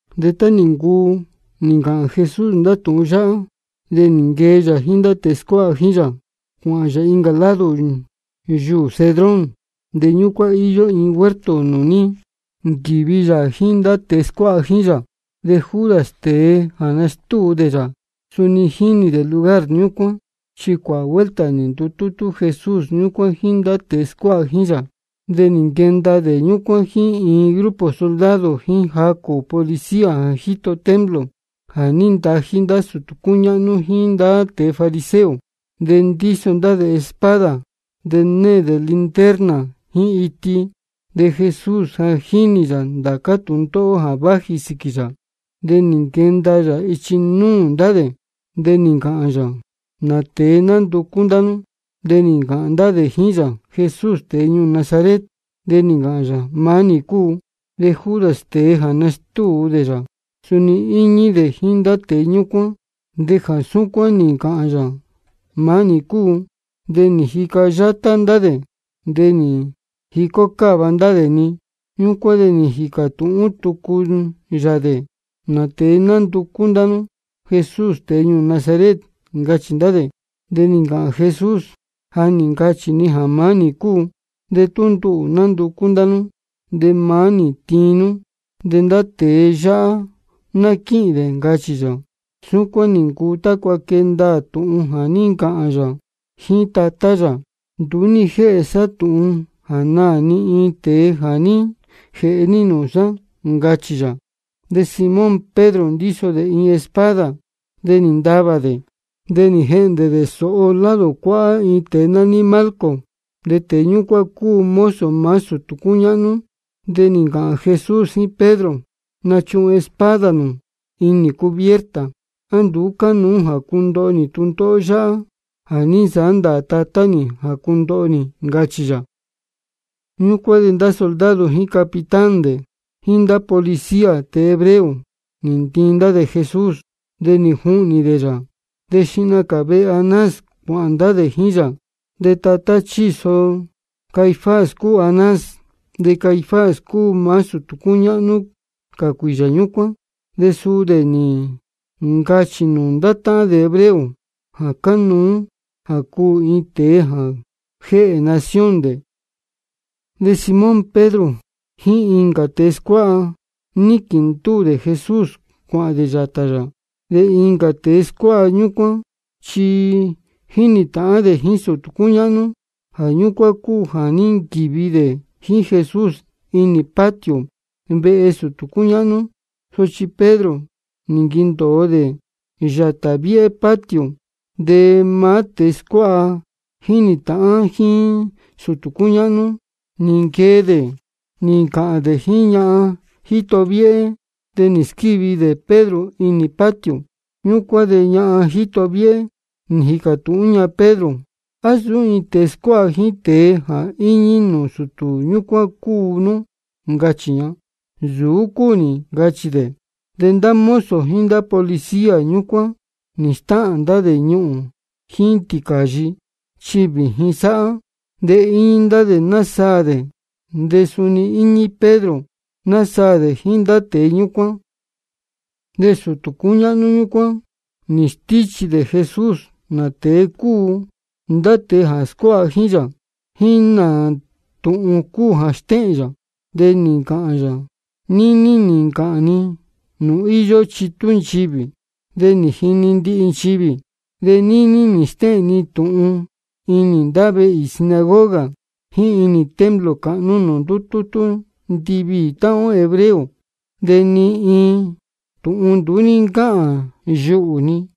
De tá nī ncuu nī ncāhān Jesús ndá tūhun yáhá, de nī nquee yā jíín ndá tēe scuáha jíín yā, cuāhān yā incā lado yuū Cedrón. De ñúcuán íyó iin huerto nūū ní nquīvi yā jíín ndá tēe scuáha jíín yā. De Judas, tēe jā nastúu dē yā, suni jínī dē lugar ñúcuán, chi cuāhā vuelta nī ndutútú Jesús ñúcuán jíín ndá tēe scuáha jíín yā. De nī nquenda dē ñúcuán jíín iin grupo soldado jíín jacū policía jā jíto templo, jā ní ntají ndá sūtū cúñáhnú jíín ndá tēe fariseo. De ndíso ndá dē espada, de née dē linterna jíín iti. De Jesús ja jínī yā ndācá tūndóhó jā váji sīquī yā. De nī nquenda yā ichi núū ndá dē, de nī ncāhān yā: ¿Nā tēe nánducú ndá nú? De nī ncāhān ndá dē jíín yā: Jesús tēe ñuū Nazaret. De nī ncāhān yā: Maá nī cúu. De Judas, tēe jā nástúu dē yā, suni íñí dē jíín ndá tēe ñúcuán. De jā súcuán nī ncāhān yā, maá nī cúu, de nī jica yátá ndá dē, de nī jicó cáva ndá dē-ni. Ñúcuán de nī jīcā tūhún tucu yā dē: ¿Nā tēe nánducú ndá nú? Jesús tēe ñuū Nazaret, ncachī ndá dē. De nī ncāhān Jesús: Ja nī ncachī ni jā maá nī cúu. De tú nduhū nánducú ndá nú, de maá nī-ni tiin nú, de ndá tēe yáhá ná quíhīn dē, ncachī yā. Súcuán nī ncuu tácua quee ndaā tūhun jā ní ncāhān yā jíín Tatá yā: Nduú ní jéhe sá tūhun jā naā ni iin tēe jā ní jēhe ní nūū sá, ncachī yā. De Simón Pedro ndíso dē iin espada. De nī ntavā dē, de nī jehndē dē sōho lado cuáhá iin tēe nání Malco. De tēe ñúcuán cúu mozo maá sūtū cúñáhnú. De nī ncāhān Jesús jíín Pedro: Nachuhun espada nū inī cubierta. ¿A nduú cánuú jā cundoho nī tūndóhó yáhá jā ní nsāhá ndāā Tatá nī jā cundoho nī? ncachī yā. Ñúcuán de ndá soldado jíín capitán dē, jíín ndá policía tēe hebreo, nī ntiin ndá dē Jesús, de nī juhnī dē yā. De xihna cā vehe Anás cuāhān ndá dē jíín yā. De tatá chíso Caifás cúu Anás. De Caifás cúu maá sūtū cúñáhnú cā cuīyā ñúcuán. De suu dē nī ncachī nūū ndá táhán dē hebreo jā cánuú jā cuū iin tēe jā jéhē nación dē. De Simón Pedro jíín incā tēe scuáha, níquīn ndúū dē Jesús cuāhān dē yātā yā. De incā tēe scuáha ñúcuán chi jínī tāhán dē jíín sūtū cúñáhnú. Jā ñúcuán cúu jā ní nquīvi dē jíín Jesús inī patio vehe sūtū cúñáhnú. Sochi Pedro nī nquendōo dē yātā viéhé patio. De maá tēe scuáha jā jínī tāhán jíín sūtū cúñáhnú, nī nquee dē nī ncāhān dē jíín ñahan jíto viéhé, de nī squívi dē Pedro inī patio. Ñúcuán de ñahan jíto viéhé, nī jīcā tūhún ña Pedro: ¿A nsūú iin tēe scuáha jíín tēe jā íñí nūū sūtū ñúcuán cúu nú? ncachī ña. Nsūú cúu nī, ncachī dē. De ndá mozo jíín ndá policía ñúcuán nī stáhān ndá dē ñuhūn jíín tīcāyi, chi vījin sáhá. De íñí ndá dē násaā dē. De suni íñí Pedro, násaā dē jíín ndá tēe ñúcuán. De sūtū cúñáhnú ñúcuán nī stíchī dē Jesús nā tēe cúu ndá tēe jā scuáha jíín yā, jíín nā tūhun cúu jā stéhēn yā. De nī ncāhān yā: Níní nī ncāhān ni nūū íyó chitú nchivī, de nī jini ndihi nchivī. De níní nī stéhēn ni tūhun inī ndá vehe īī sinagoga jíín inī templo cāhnú nūū ndútútú ndiviī táhán ó hebreo. De ni iin tūhun nduú ní ncáhān yuhū ni.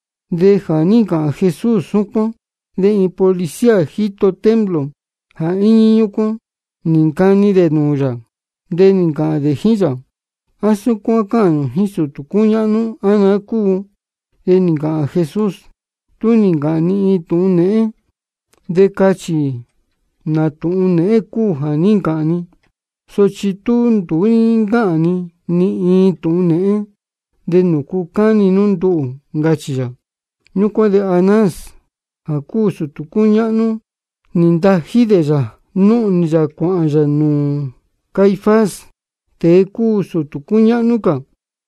De jā ní ncāhān Jesús súcuán, de iin policía jíto templo jā íñí ñúcuán, nī ncani dē nūū yā. De nī ncāhān dē jíín yā: ¿A súcuán cáhān nū jíín sūtū cúñáhnú, á naá cúu? De nī ncāhān Jesús: Tú nī ncāhān ni iin tūhun nēhén, de cachī nā tūhun nēhén cúu jā ní ncāhān ni. Sochi tú nduú ní ncáhān ni iin tūhun nēhén, ¿de nūcu cáni nú nduhū? ncachī yā. Ñúcuán de Anás jā cúu sūtū cúñáhnú, nī ntají dē yā, núhnī yā cuāhān yā nūū Caifás, tēe cúu sūtū cúñáhnú cā.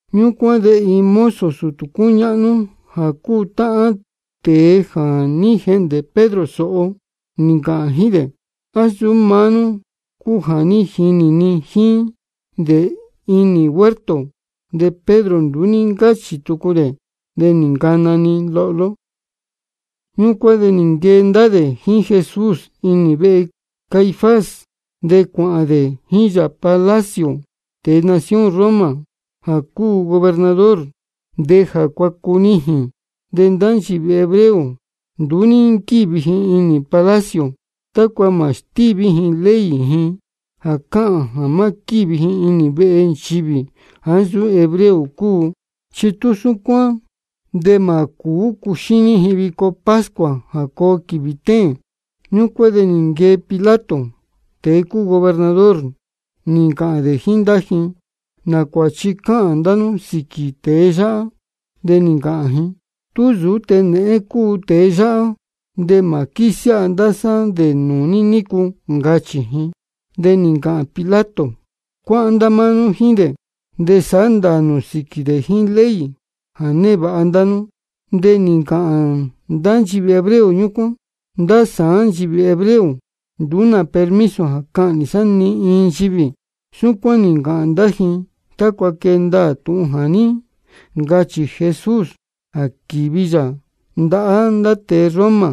Ñúcuán de iin mozo sūtū cúñáhnú jā cúu táhán tēe jā ní jehndē Pedro sōho, nī ncāhān jíín dē: ¿A nsūú maá nú cúu jā ní jinī ni jíín dē inī huerto? De Pedro nduú ní ncáchī tucu dē. De nī ncana-ni lohló. Ñúcuán de nī nquee ndá dē jíín Jesús inī vehe Caifás, de cuāhān dē jíín yā palacio tēe nación Roma jā cúu gobernador. De ja cuācunijīn. De ndá nchivī hebreo nduú ní nquívi ji inī palacio, tácua mā stíví ji ley ji jā cáhān jā má quívi ji inī vehe nchivī jāá nsūú hebreo cúu. Chi tú súcuán de mā cūú cuxíní ji vico pascua jā coo quīvī téēn. Ñúcuán de nī nquee Pilato, tēe cúu gobernador, nī ncāhān dē jíín ndá ji: ¿Nā cuāchi cáhān ndá nú sīquī tēe yáhá? De nī ncāhān ji: Tú nsūú tēe nēhén cúu tēe yáhá, de mā quísiáha ndá sá dē nūū ní nícu, ncachī ji. De nī ncāhān Pilato: Cuáhán ndá máá nú jíín dē, de sāhá ndāā nū sīquī dē jíín ley jā névāha ndá nú. De nī ncāhān ndá nchivī hebreo ñúcuán: Ndá sāán nchivī hebreo, nduú nā permiso jā cahnī sá ni iin nchivī. Súcuán nī ncāhān ndá ji tácua quee ndaā tūhun jā ní ncachī Jesús jā quīvi yā ndahá ndá tēe Roma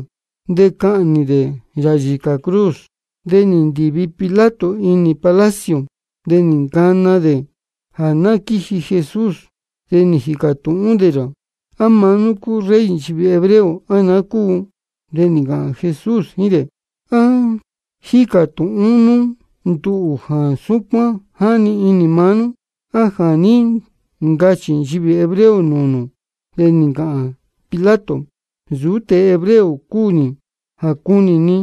de cahnī dē yā yīcā cruz. De nī ndīvi Pilato inī palacio, de nī ncana dē jā ná quíji Jesús. De nī jīcā tūhún dē yā: ¿A maá nú cúu Rey nchivī hebreo, á naá cúu? De nī ncāhān Jesús jíín dē: ¿A jícā tūhún nú nduhū jā súcuán jáni inī maá nú, á jā ní ncachī nchivī hebreo nūū nū? De nī ncāhān Pilato: Nsūú tēe hebreo cúu nī jā cunī ni.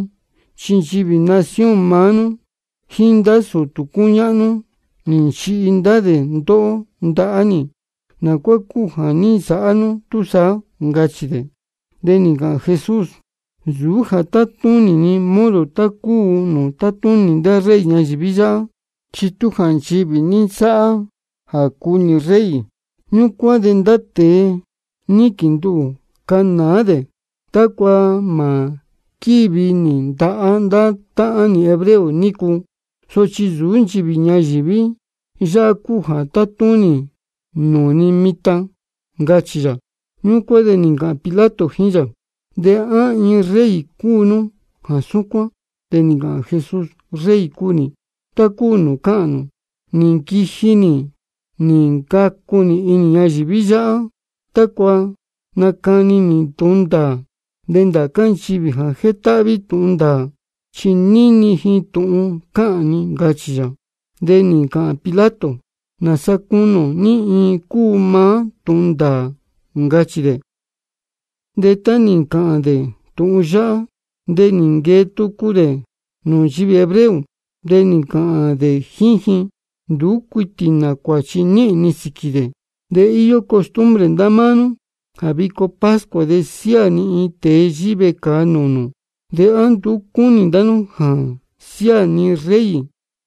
Chi nchivī nación maá nú jíín ndá sūtū cúñáhnú nī nchihi ndá dē ndóhó ndahá nī. ¿Nā cuá cúu jā ní nsāhá nú túsaá? ncachī dē. De nī ncāhān Jesús: Nsūú jā tátúnī ni modo tá cúu nūū tátúnī ndá rey ñayīví yáhá. Chi tú jā nchivī ñayīví ní nsáhá jā cúu nī rey, ñúcuán de ndá tēe níquīn nduhū canāá dē tácua mā quívi nī ndahá ndá táhán nī hebreo nícu. Sochi nsūú nchivī ñayīví yáhá cúu jā tátúnī ni nūū mitan, ncachī yā. Ñúcuán de nī ncāhān Pilato jíín yā: ¿De á iin rey cúu nú jā súcuán? De nī ncāhān Jesús: Rey cúu nī, tá cúu nūū cáhān nū. Nī nquiji nī nī ncacu nī inī ñayīví yáhá tácua nacani nī tūhun ndāā. De ndācá nchivī jā jétáhví tūhun ndāā, chi níni ji tūhun cáhān ni, ncachī yā. De nī ncāhān Pilato: ¿Nāsa cunī ō ní iin cúu maá tūhun ndāā? ncachī dē. De tá nī ncāhān dē tūhun yáhá, de nī nquee tucu dē nūū nchivī hebreo. De nī ncāhān dē jíín ji: Nduú cuitī nā cuāchi níhīn ni sīquī dē. De íyó costumbre ndá máá nú jā vico pascua de siáā ni iin tēe yíhí vecāa nūū nū. ¿De á nduú cúnī ndá nú jā siáā ni Rey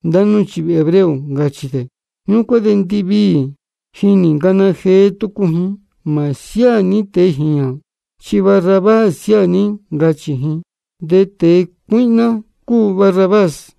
ndá nú nchivī hebreo? ncachī dē. Ñúcuán de ndiviī ji nī ncana jee tucu ji: Mā siáā ní tēe jīñā, chi Barrabás siáā ní, ncachī ji. De tēe cuíhná cúu Barrabás.